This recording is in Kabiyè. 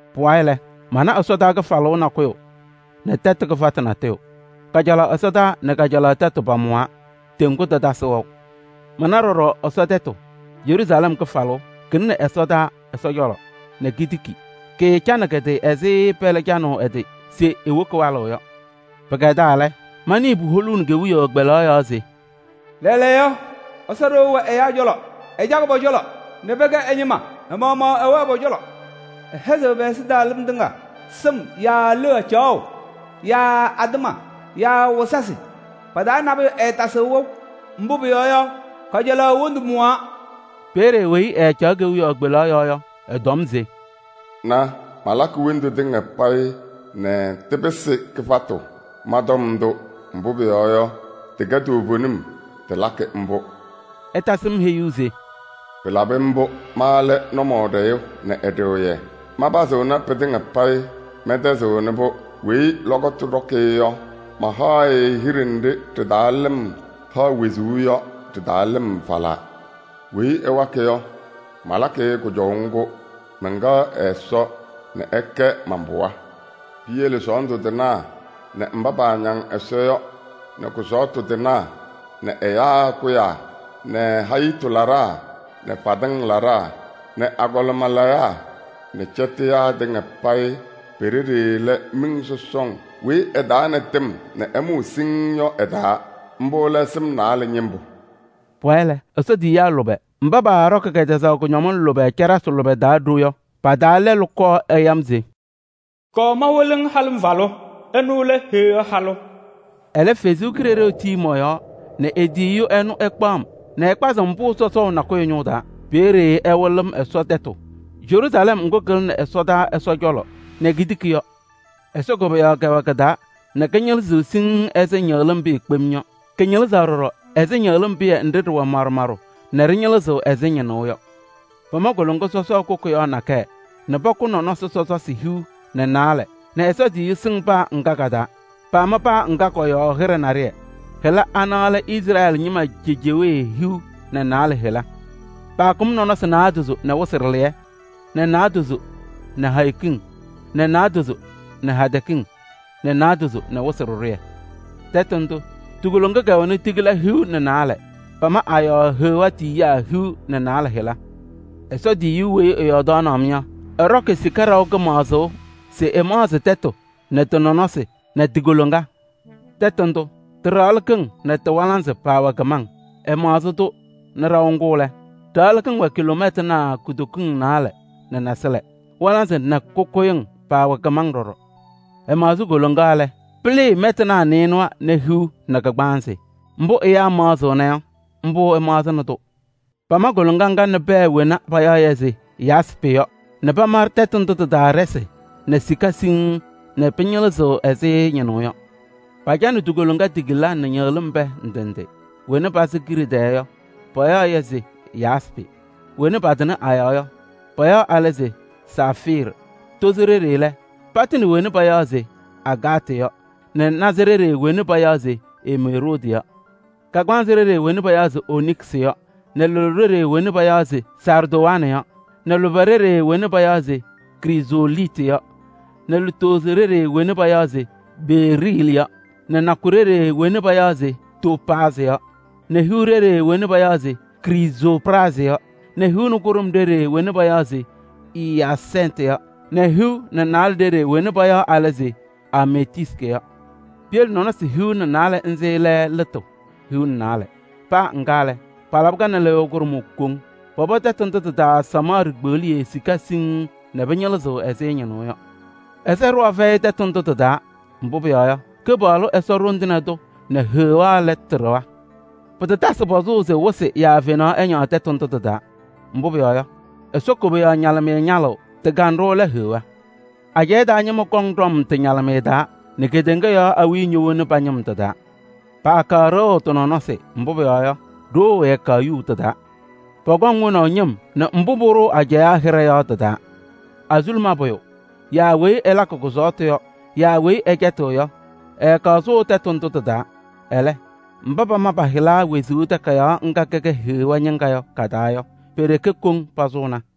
Pʋwayɩ lɛ, mana ɛsɔtɔnʋʋ kɩfalʋʋ nakʋyʋ nɛ tɛtʋ kɩfatʋ natʋyʋ. Kajalaɣ ɛsɔtɔnʋʋ nɛ kajalaɣ tɛtʋ pamʋwaa, teŋgu tatasɩ wɛʋ. Mana ɖɔɖɔ Ɛsɔ tɛtʋ: Yeruusalɛm kɩfalʋʋ, kɩlɩnɩ ɛsɔdaa Ɛsɔ cɔlɔ nɛ kitiki, kɩɩcanɩ kɩ-tɩ ɛzɩ pɛlɛ canʋʋ ɛ-tɩ se ewoki walʋʋ yɔ. Pɩkɛdaa lɛ, manɩɩ puholuuni kewiyaɣ kpelaɣ yɔɔ se: “Lɛɛlɛɛyɔ Ɛsɔ ɖɩɣa wɛ ɛyaa cɔlɔ! Ɛcakɩ pɔ-cɔlɔ nɛ pɛkɛ ɛ-ñɩma. Ɛ-maɣmaɣ ɛwɛɣ pɔ-cɔlɔ. Ɛhɛzɩɣ pɛ-ɛzɩtɛɣlɩm tɩŋa. Sɩm yaa leɣa caɣʋ yaa atɩma yaa wɩzasɩ pa-taa nabʋyʋ ɛɛtasɩɣ wɛʋ. Mbʋ pʋyɔɔ yɔ, kajalaɣ wondu mʋwaa.” Peeye weyi ɛɛcaɣ kewiyaɣ kpelaɣ yɔɔ yɔ, ɛtɔm se: “Na! Malakɩ wondu tɩŋa payɩ nɛ tɩpɩsɩ kɩfatʋ. Ma tɔm ndʋ, mbʋ pʋyɔɔ yɔ, tɩkɛ toovenim, tɩlakɩ mbʋ.” Ɛtasɩ-m heyuu se: “Pɩlabɩ mbʋ! Ma lɛ Nʋmɔɖɛyʋ nɛ Ɛɖɩɣyɛ, manpazɩnɩ pɩtɩŋa payɩ, mɛntɛzɩɣnɩ-pʋ. Weyi lɔkɔtʋ ɖɔkɩ-ɩ yɔ, mahaɣ-ɩ hiɖe nɖɩ ɖɩ-taa lɩm haɣ wezuu yɔ ɖɩ-taa lɩm falaa. Weyi ɛwakɩ yɔ, malakɩ-ɩ kʋjɔʋ ŋgʋ. Mɛnkɛɣ ɛ-Ɛsɔ nɛ ɛkɛ man-pɩɣa. Piyele sɔɔndʋ tɩnaa nɛ mba paañaŋ Ɛsɔ yɔ nɛ kʋsɔɔtʋ tɩnaa nɛ ɛyaa kʋyaa nɛ hayitu laɖaa nɛ fadɩŋ laɖaa nɛ agɔlɩma layaa nɛ cɛtɩyaa tɩŋa payɩ pe-ɖeɖe lɛ miŋ sɔsɔŋ weyi ɛ-taa nɛ tɩm nɛ ɛmʋʋ siŋŋ yɔ ɛ-taa: mbʋ lɛ sɩm naalɛ ñɩmbʋ.” Pʋwayɩ lɛ, Ɛsɔ tiyiyaa lʋbɛ mba paaɖɔkɩ kɛtɛzaɣ kʋñɔmɩŋ lʋbɛ caɖasɩ lʋbɛ taa ɖo yɔ, pa-taa lɛlʋ kɔɔ ɛya-m se: “Kɔɔ mawɩlɩ-ŋ halɩmvalʋ, ɛnʋ lɛ Heɣa halʋ.” Ɛlɛ Ɛsɔ Kalɩzaɣ tii mɔ-yɔɔ nɛ e-tiyiyu ɛnʋ ɛkpaɣ-m nɛ ɛkpazɩ-m pʋʋ sɔsɔʋ nakʋyʋ ñʋʋ taa. Peeye ɛwɩlɩ-m Ɛsɔ tɛtʋ, Yeruusalɛm ŋgʋ kɩlɩnɩ ɛsɔdaa Ɛsɔ cɔlɔ nɛ kitiki yɔ. Ɛsɔ koboyaɣ kɛwɛ kɩ-taa nɛ kɩñɩlɩzɩɣ siŋŋ ɛzɩ ñɩɣlɩm pɩyɛ kpem yɔ. Kɩñɩlɩzaɣ ɖɔɖɔ ɛzɩ ñɩɣlɩm pɩyɛ nɖɩ ɖɩwɛ maɖʋ maɖʋ nɛ ɖɩñɩlɩzɩɣ ɛzɩ ñɩnʋʋ yɔ. Pama koloŋa sɔsɔɔ kʋkʋyaɣ nakɛyɛ nɛ pakʋ nɔnɔsɩ sɔsɔsɩ hiu nɛ naalɛ nɛ Ɛsɔ tiyiyu sɩŋ paa ŋga ka-taa. Paama paa ŋga kɔ-yɔɔ hɩɖɛ naɖɩyɛ. Hɩla ana lɛ Izrɛɛlɩ ñɩma cejewee hiu nɛ naalɛ hɩla. Paakʋm nɔnɔsɩ naadozo nɛ wɩsɩ ɖɩlɩyɛ nɛ naadozo nɛ hayo kiŋ nɛ naadozo nɛ hadɛ kiŋ nɛ naadozo nɛ wɩsɩ ɖɩɖʋyɛ. Tɛtʋ ndʋ, ti-koloŋa kɛwɛnɩ tigila hiu nɛ naalɛ, pama a-yɔɔ Heɣa tiyiyaa hiu nɛ naalɛ hɩla. Ɛsɔ tiyiyu weyi ɛyɔɔdaɣnɩ-m yɔ, ɛɖɔkɩ sika ɖaʋ kɩmaɣzʋʋ se ɛmaɣzɩ tɛtʋ nɛ tɩ-nɔnɔsɩ nɛ ti-koloŋa. Tɛtʋ ndʋ, tɩ-ɖaɣlɩkɩŋ nɛ tɩ-walaanzɩ paawɛ kɩmaŋ. Ɛmaɣzɩ-tʋ nɛ ɖaʋ ŋgʋ lɛ, ɖaɣlɩkɩŋ wɛ kiloomɛtanaa kutokiŋ naalɛ nɛ nasɩlɛ. Walaanzɩ nɛ kʋkʋyɩmɩŋ paawɛ kɩmaŋ ɖɔɖɔ. Ɛmaɣzɩ koloŋa lɛ, pɩlɩɩ mɛtanaa nɩɩnʋwa nɛ hiu nɛ kagbaanzɩ. Mbʋ ɛyaa maɣzɩɣna yɔ, mbʋ ɛmaɣzɩnɩ-tʋ. Pama koloŋa ŋga nɛ pɛɛ wena payaɣ se yaaspɩ yɔ nɛ pama tɛtʋ ndʋ tɩ-taa ɖɩsɩ nɛ sika siŋŋ nɛ pɩñɩlɩzɩɣ ɛzɩ ñɩnʋʋ yɔ. Pacanɩ ti-koloŋa tigila nɛ ñɩɣlɩm pɛɛ ndɩ ndɩ: wena pasɩ kiɖe tɛɛ yɔ, payaɣ-yɛ se yaaspɩ, wena patɩnɩ a-yɔɔ yɔ, payaɣ alɛ se saafiirɩ, tozo ɖeɖe lɛ, patɩnɩ wena payaɣ se agaatɩ yɔ nɛ naza ɖeɖe wena payaɣ se emeroodɩ yɔ, kagbaanzɩ ɖeɖe wena payaɣ se oniksɩ yɔ nɛ loɖo ɖeɖe wena payaɣ se saardowanɩ yɔ nɛ lʋbɛ ɖeɖe wena payaɣ se krizooliitɩ yɔ nɛ lutozo ɖeɖe wena payaɣ se beeriilɩ yɔ nɛ nakʋ ɖeɖe wena payaɣ se toopaazɩ yɔ nɛ hiu ɖeɖe wena payaɣ se krizoopraazɩ yɔ nɛ hiu nɛ kʋɖʋm ɖeɖe wena payaɣ se iyaasɛntɩ yɔ nɛ hiu nɛ naalɛ ɖeɖe wena payaɣ alɛ se ameetiistɩ yɔ. Piyele nɔnɔsɩ hiu nɛ naalɛ nzɩ lɛ lɩtʋ hiu nɛ naalɛ. Paa ŋga lɛ, palabɩ-kɛ nɛ lɩyʋʋ kʋɖʋmʋʋ koŋ. Pɔpɔ tɛtʋ ndʋ tɩ-taa samaɣ ɖikpeɣliye sika siŋŋ nɛ pɩñɩlɩzɩɣ ɛzɩ ñɩnʋʋ yɔ. Ɛsɔ ɖɩɣa fɛyɩ tɛtʋ ndʋ tɩ-taa, mbʋ pʋyɔɔ yɔ, Kɩpaɣlʋ Ɛsɔ Ɖoŋ Tɩŋa Tʋ nɛ Heɣa lɛ tɩ-ɖɩɣa. Pɩtatasɩ pɔzʋʋ se wɩsɩ yaa fenaɣ ɛñaɣ tɛtʋ ndʋ tɩ-taa. Mbʋ pʋyɔɔ yɔ, Ɛsɔ koboyaɣ ñalɩmɩyɛ ñalɩɣ, tɩ-kanɖʋ lɛ Heɣa. Ajɛɛ taa ñɩma kɔŋ ɖɔm tɩ-ñalɩmɩyɛ taa nɛ kedeŋa yɔɔ awiya ñowoni pa-ñɩm tɩ-taa. Paakaɣ ɖɩɣʋ tɩ-nɔnɔsɩ, mbʋ pʋyɔɔ yɔ, ɖoo ɛɛkaɣ yuu tɩ-taa. Pɔkɔŋ wonaʋ ñɩm nɛ mbʋ pʋɖʋʋ ajɛɛ hɩɖɛ yɔ tɩ-taa. Azuluma pʋyʋ yaa weyi ɛlakɩ kʋsɔɔtʋ yɔ yaa weyi ɛcɛtɩɣ yɔ, ɛɛkaɣ sʋʋ tɛtʋ ndʋ tɩ-taa. Ɛlɛ, mba pama pa-hɩla wezuu takayaɣ ŋga kɛkɛ Heɣa ñɩŋga yɔ ka-taa yɔ, pe-ɖeke koŋ pasʋʋna.